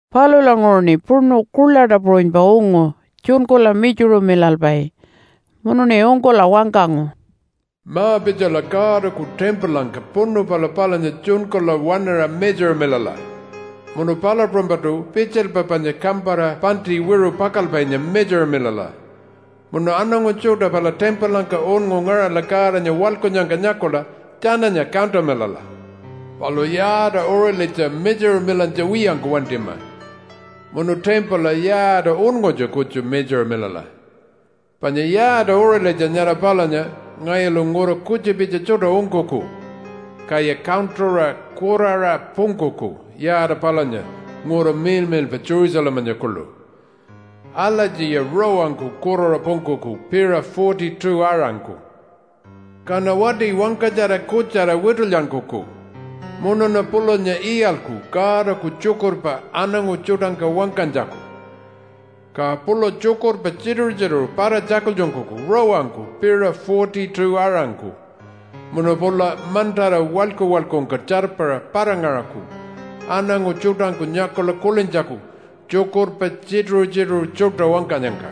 Palulanguṟuṉi puṉu kuḻaṯa puṟunypa ungu tjunkula mitjuṟumilalpai munuṉi ungkula wangkangu, “Ma-pitjala Godaku timpulangka puṉu pala palunya tjunkula waṉaṟa mitjuṟamilala, munu palu puṟunypaṯu pitjilpa panya kampara paṉṯi wiṟu pakalpainya mitjuṟamilala. Munu aṉangu tjuṯa pala timpulangka unngu ngaṟala Godanya waḻkunnyangka nyakula tjananya kantamilala. Palu yaata uṟilitja mitjuṟumilantja wiyangku wantima munu timpula yaata unngutja kutju mitjuṟamilala. Panya yaata uṟilitja nyara palunya ngayulu ngura kutjupitja tjuṯa ungkuku, kaya kantuṟa kuraṟa pungkuku yaata palunya ngura miḻmiḻpa Jerusalemanya kuḻu. Alatjiya rawangku kuraṟa pungkuku piṟa 42-aṟangku. “Kaṉa wati wangkatjara kutjara witulyankuku munuṉa pulanya iyalku Godaku tjukurpa aṉangu tjuṯangka wangkanytjaku. Ka pula tjukurpa tjituṟu-tjituṟu para-tjakultjunkuku rawangku piṟa 42-aṟangku. Munu pula mantara walyku-walykungka tjarpara para-ngaṟaku aṉangu tjuṯangku nyakula kulintjaku tjukurpa tjituṟu-tjituṟu tjuṯa wangkanyangka.”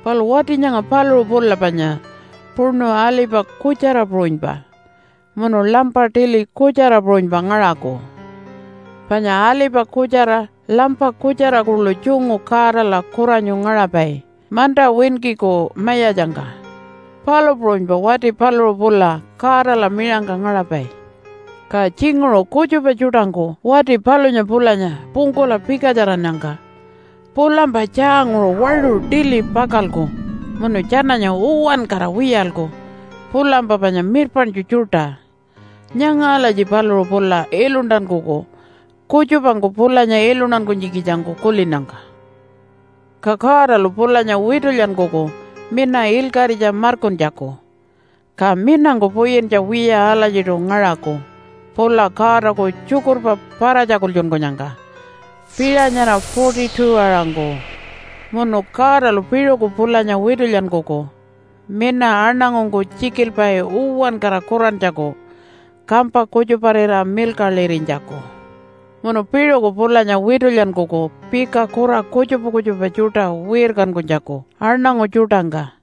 Palu wati nyanga paluṟu pula panya puṉu alipa kutjara puṟunypa munu lampa tili kutjara puṟunypa ngaṟaku. Panya alipa kutjara lampa kutjara kuḻu tjungu Godala kuranyu ngaṟapai, manta winkiku Mayatjangka, palu puṟunypa wati paluṟu pula Godala miṟangka ngaṟapai. Ka tjinguṟu kutjupa tjuṯangku wati palunya pulanya pungkula pikatjarannyangka pulampa tjaanguṟu waṟu tili pakalku munu tjananya uwankara wiyalku pulampa panya mirpaṉtju tjuṯa. Nyanga alatji paluṟu pula iluntankuku kutjupangku pulanya iluntankunytjikitjangku kulinnyangka. Ka Godalu pulanya witulyankuku mina ilkaṟitja markuntjaku, ka minangku puyintja wiya alatjiṯu ngaṟaku pula Godaku tjukurpa para-tjakultjunkunyangka piṟa nyara 42-aṟangku. Munu Godalu piṟuku pulanya witulyankuku mina aṉangungku tjikilpai uwankara kurantjaku kampa kutjuparira milkaḻirinytjaku. Munu piṟuku pulanya witulyankuku pika kura kutjupa kutjupa tjuṯa wirkankunytjaku aṉangu tjuṯangka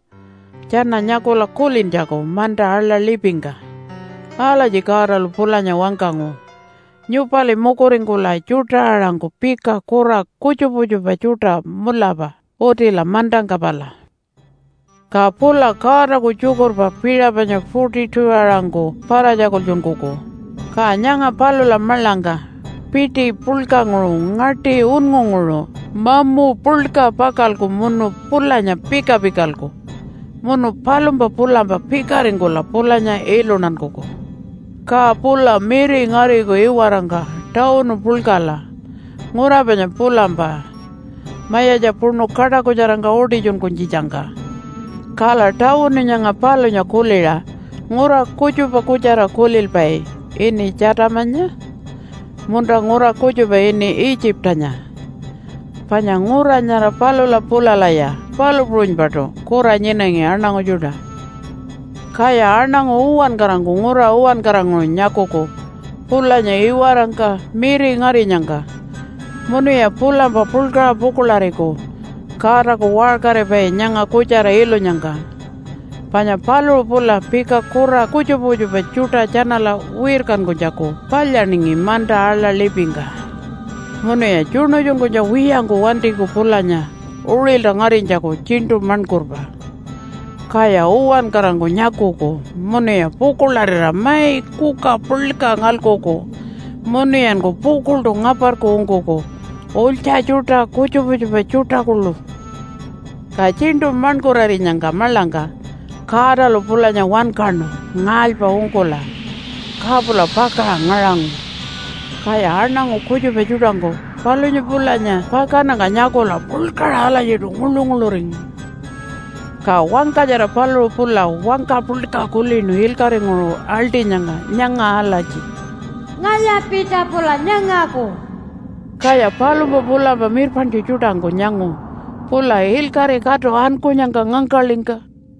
tjana nyakula kulintjaku manta aḻa lipingka. Alatji Godalu pulanya wangkangu, “Nyupali mukuringkula tjuṯa-aṟangku pika kura kutjupa kutjupa tjuṯa mulapa utila mantangka pala.” Ka pula Godaku tjukurpa piṟa panya 42-aṟangku para-tjakultjunkuku, ka nyanga palula maḻangka piṯi puḻkanguṟu ngaṯi unngunguṟu mamu puḻka pakalku munu pulanya pika-pikalku. Munu palumpa pulampa pikaringkula pulanya iluntankuku. Ka pula miri ngariku iwarangka tawunu puḻkala, ngura panya pulampa mayatja puṉu kaṯakutjarangka utitjunkunytjitjangka. Kala tawunu nyanga palunya kuliṟa ngura kutjupa kutjara kulilpai ini Tjatamanya munta ngura kutjupa ini Itjipanya, panya ngura nyara palula pulalaya palu puṟunypaṯu kura nyinangi aṉangu tjuṯa. Kaya aṉangu uwankarangku ngura uwankaranguṟu nyakuku pulanya iwarangka miri ngarinyangka munuya pulampa puḻkaṟa pukuḻariku Godaku waṟkaripai nyanga kutjara ilunyangka, panya paluṟu pula pika kura kutjupa kutjupa tjuṯa tjanala wirkankunytjaku palyaningi manta aḻa lipingka. Munuya tjuṉutjunkunytja wiyangku wantiku pulanya uṟilta ngarinytjaku tjiṉṯu maṉkurpa, kaya uwankarangku nyakuku munuya pukuḻarira mai kuka puḻka ngalkulku munuyanku pukuḻṯu ngaparku ungkuku ulytja tjuṯa, kutjupa kutjupa tjuṯa kuḻu. Ka tjiṉṯu maṉkurarinyangka maḻangka Godalu pulanya wankaṉu ngaalypa ungkula ka pula pakaṟa ngaṟangu. Kaya aṉangu kutjupa tjuṯangku palunya pulanya pakannyangka nyakula puḻkaṟa alatjiṯu nguḻu-nguḻuringu. Ka wangkatjara paluṟu pula wangka puḻka kulinu ilkaṟinguṟu aḻṯinyangka nyanga alatji, “Ngalya-pitja pula nyangaku!” Kaya palumpa pulampa mirpaṉtju tjuṯangku nyangu pula ilkaṟi katu ankunyangka ngangkaḻingka.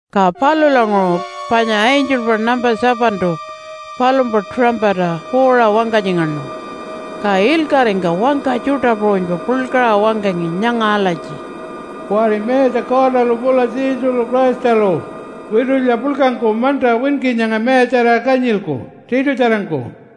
Ka palulanguṟu panya angelpa nampa 7-tu palumpa tuṟampata puuṟa wangkatjingaṉu, ka ilkaṟingka wangka tjuṯa puṟunypa puḻkaṟa wangkangi nyanga alatji, “Kuwari Mayatja Godalu pula Jesulu Christalu witulya puḻkangku manta winki nyanga mayatjarira kanyilku tiṯutjarangku.”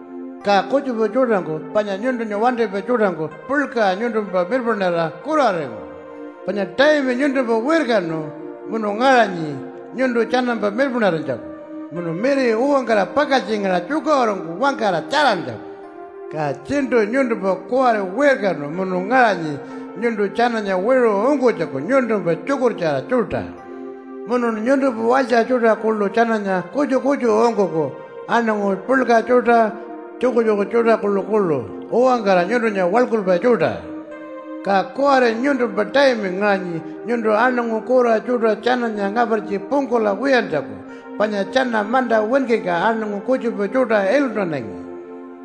Ka kutjupa tjuṯangku panya nyuntunya wantipai tjuṯangku puḻkaṟa nyuntumpa mirpaṉarira kuraringu, panya taimi nyuntumpa wirkanu munu ngaṟanyi nyuntu tjanampa mirpaṉarinytjaku munu miri uwankara pakaltjingaṟa tjukaṟurungku wangkara tjarantjaku. Ka tjiṉṯu nyuntumpa kuwari wirkanu munu ngaṟanyi nyuntu tjananya wiṟu ungkunytjaku nyuntumpa tjukurtjara tjuṯa. Munun nyuntumpa walytja tjuṯa kuḻu tjananya kutju kutju ungkuku, aṉangu puḻka tjuṯa, tjukutjuku tjuṯa kuḻukuḻu uwankara nyuntunya waḻkulpai tjuṯa. Ka kuwari nyuntumpa taimi ngaṟanyi nyuntu aṉangu kura tjuṯa tjananya ngapartji pungkula wiyantjaku, panya tjana manta winkingka aṉangu kutjupa tjuṯa iluntanangi.”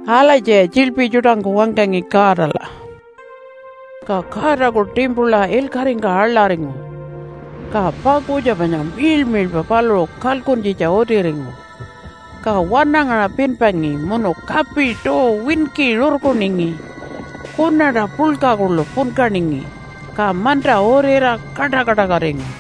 Alatjiya tjiḻpi tjuṯangku wangkangi Godala. Ka Godaku timpula ilkaṟingka aḻaringu. Ka pakutja panya miḻmiḻpa paluṟu kalkuntjitja utiringu. Ka wanangaṟa pinpangi munu kapi tuu winki rurkuningi, kunaṯa puḻka kuḻu punkaningi, ka manta urira kaṯa-kaṯakatingu.